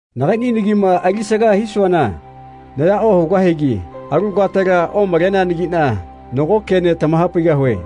Nagaiꞌni nagima alisaga hisuana naya ohugahigi alu katela omaleneanagiꞌna nago kene tamahapaigahue.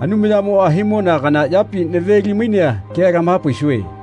Anumayamoꞌa himona kana yapi naveli-mainea kea tamahapaisue.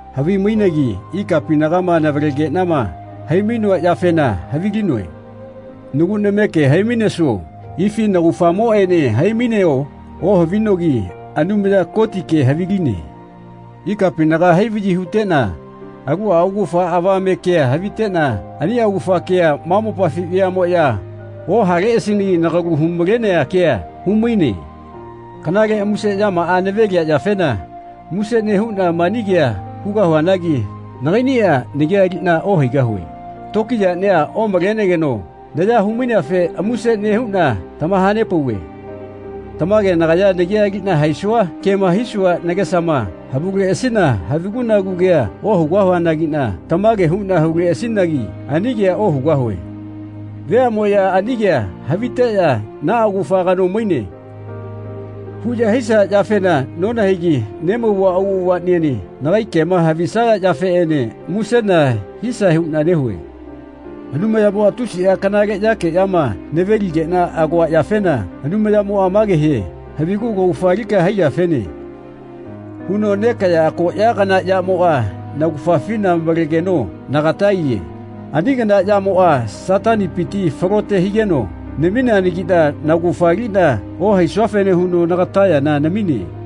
Havimainegi ikapinaga navalegeꞌnama hai-mainoa yafena havilinoe. Nagu nameke hai-mainesuo ifi naugafamoꞌene hai-maineo ohavinogi Anumaya Kotike haviline. Ikapinaga hai-vaꞌyi huteꞌna aluꞌa augafa avamete kea haviteꞌna ani augafa kea ma mopafi veaꞌmoꞌya ohaleꞌasinagi nagalu hu-malenea kea humaine. Kanale muse yamaꞌa navelia yafena muse nehuꞌna mani kea hugahuanagi nagaiꞌniꞌa nagia aliꞌna ohaigahue. Tokiyaꞌnia omalegeno naya humaineafe muse nehuꞌna tamahanepauve. Tamage nagaya nagia aliꞌna haisua kema hisua nagesama havuleꞌasina havigu-nagu kea ohugahuanagiꞌna tamage huꞌna huleꞌasinagi ani kea ohugahue. Veaꞌmoꞌya ani kea haviteꞌya “Naꞌa augafa kano maine.” huꞌya hisaya yafena nonahaigi nemauva auꞌavaꞌniene nagai kema havisaya yafeꞌene musena hisae huꞌna nehue. Anumayamoꞌa tusiꞌa kanale yakeꞌyama naveligeꞌna agoa yafena Anumayamoꞌa mage hie “Havigu kaugafa alika haiyafene.” huno nekaꞌya akoꞌya kana yamoꞌa naugafafina malegeno nagata aiye. Ani kana yamoꞌa Satanipiti falote higeno namineanagiꞌna naugafa aliꞌna ohaisuafene huno nagata yana namine.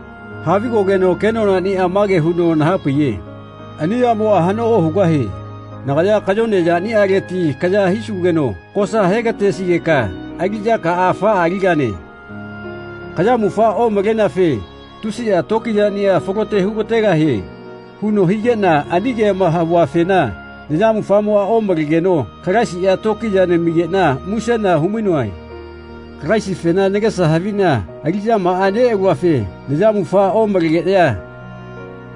Havigogeno kenonaꞌnia mage huno nahapaiye “Ani yamoꞌa haꞌno ohugahie. Nagaya kayone yaniꞌaleti kaya hisugeno kosa hegatesigeka aliꞌyakaꞌa afaꞌa aligane. Kayamufa omaleneafe tusiꞌa tokiyaꞌnia falote hugategahie.” huno higeꞌna ani kema havuafena nayamufa omalegeno Kalaisiꞌa tokiya namigeꞌna musena humainoe. Kalaisifena nagesa haviꞌna aliꞌyamaꞌa neꞌaluafe nayamufa omalegeꞌya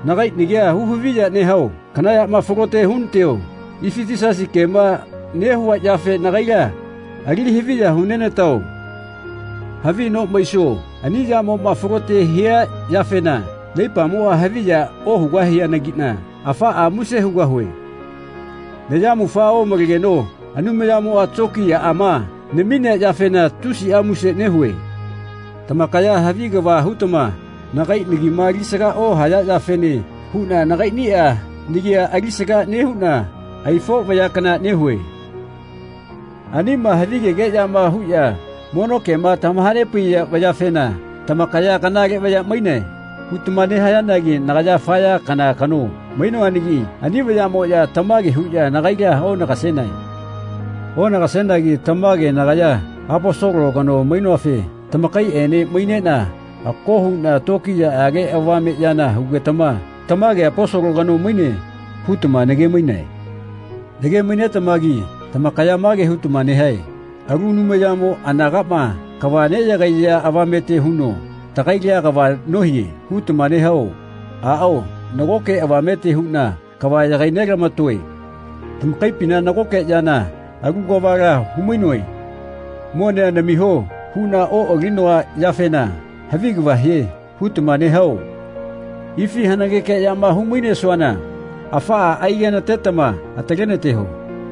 nagai nagia hu-haviya nehao kana yama falote hunateo ifi Yisasi kema nehua yafe nagaila ali haviya hunenatao havi no maisuo ani yamoꞌma falote hia yafena naipamoꞌa haviya ohugahianagina afaꞌa muse hugahue. Nayamufa omalegeno Anumayamoꞌa tokiyaꞌama naminea yafena tusiꞌa muse nehue. Tamakaya havi kava hutama nagai nagima alisaga ohayafene huꞌna nagaiꞌniꞌa nagia alisaga nehuꞌna aifo vaya kana nehue. Anima havigegeꞌyama huꞌya mono kema tamahanepaiya vayafena tamakaya “Kanale vaya mainae.” hutama nehayanagi nagaya afa ya kana kano mainoanagi ani vayaꞌmoꞌya tamage huꞌya nagaila onagasenae. Onagasenagi tamage nagaya Aposolo kano mainoafe tamakaiꞌene maineꞌna ako huꞌna tokiyaꞌage avame yana hugetama “Tamage Aposolo kano maine.” hutama nage-mainae. Nage-mainetamagi tamakaya mage hutama nehae “Alu Anumayamo anagaꞌma kava neꞌyagaiya avamete huno tagaila kava nohie.” hutama nehao? Aꞌao, nagoke avamete huꞌna kava yagainelamatoe. Tamakaipina nagoke yana alu kavala humainoe “Monea namiho.” huꞌna oꞌalinoa yafena “Havi kava hie.” hutama nehao? Ifi hanageke yama hu-mainesuana afaꞌa aigenatetama atalenateho.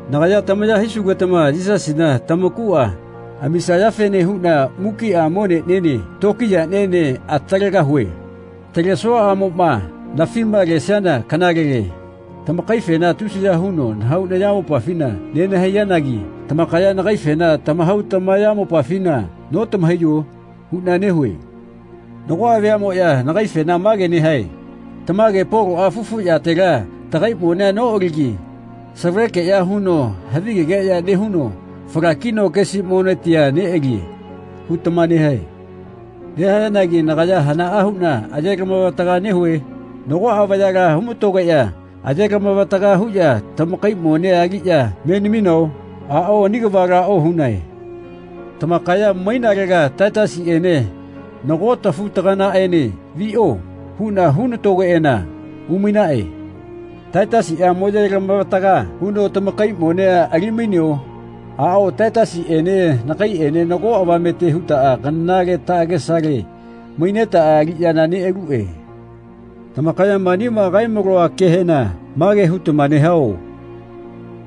Nagaya tamaya hisugetama Yisasina tamakuꞌa amisayafene huꞌna mukiꞌa moneꞌniene tokiyaꞌniene atalegahue. Atalesuaꞌamoꞌma nafima lesiana kanalele. Tamakaifena tusiya huno nahau nayamopafina nenahaiyanagi tamakaya nagaifena tamahau tamayamopafina notamahaiyo? huꞌna nehue. Nagoꞌa veaꞌmoꞌya nagaifena mage nehae “Tamage Poloꞌa fufu yatela tagai monea noꞌaligi savalekeꞌya huno havigegeꞌya nehuno falakino kesi monetia neꞌalie.” hutama nehae. Nehayanagi nagaya hanaꞌa huꞌna ayelamavataga nehue? Nagoꞌa vayala humatogeꞌya ayelamavataga huꞌya tamakai monea aliꞌya me naminao? Aꞌao ani kavala ohunae. Tamakaya mainalega Taitasiꞌene nago tafu-taganaꞌene “Viꞌo.” huꞌna hunatogeꞌana umainaꞌe. Taitasiꞌa mo ayelama-vataga huno tamakai monea ali-maineo? Aꞌao Taitasiꞌene nagaiꞌene nago avamete hutaꞌa kanale taꞌagesale mainetaꞌa aliꞌyana neꞌaluꞌe. Tamakaya manima kae-maloa kehena mage hutama nehao?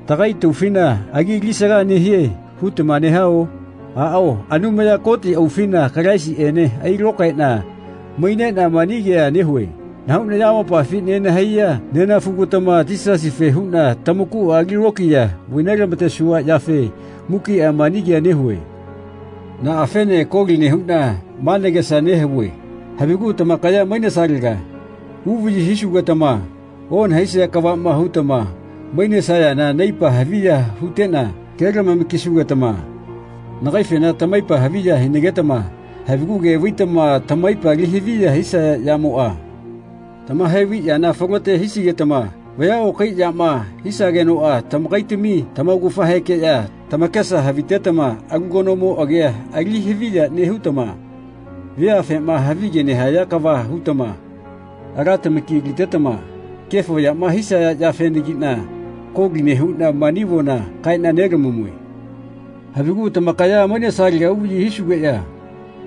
“Tagai taufina agi alisaga nehie.” hutama nehao? Aꞌao Anumaya Koti aufina Kalaisiꞌene ailokaeꞌna maineꞌna mani kea nehue. Nahau nayamopafi nenahaiya nenafugatama Yisasife huꞌna tamakuꞌa ali lokiya vailamatesua yafe mukiꞌa mani kea nehue. Naꞌafene koli nehuꞌna ma nagesa nehavue havigu tamakaya mainesalega uvaꞌyi hisugetama onahaisia kavaꞌma hutama mainesayana naipa haviya huteꞌna kelamama-kisugetama nagaifena tamaipa haviya hinagetama havigu ke vaitama tamaipa ali haviya hisaya yamoꞌa tamahaivai yana falote hisigetama vaya okai yama hisagenoꞌa tamakaitami tamaugafahekeꞌya tamakesa havitetama alu kanomo agia ali haviya nehutama veafema havige nehaya kava hutama ala tamaki alitetama kefo yama hisaya yafenagiꞌna koli nehuꞌna mani avona kaeꞌna nelamamue. Havigu tamakaya mainesalega uvaꞌyi hisugeꞌya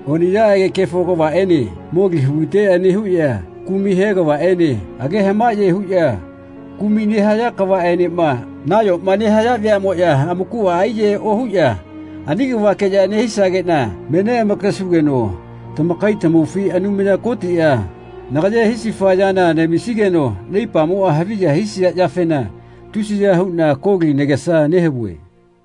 oniꞌyaꞌage kefo kavaꞌene moli huliteꞌya nehuꞌya kumai he kavaꞌene age hamaꞌye huꞌya kumai nehaya kavaꞌenema nayoma nehaya veaꞌmoꞌya amakuꞌa aiyahae ohuꞌya ani kavakeꞌya nehisageꞌna me neꞌamakesugeno tamakai tamaufi Anumaya Kotiꞌa nagaye hisifa yana namisigeno naipamoꞌa haviya hisia yafena tusiya huꞌna koli nagesa nehavue.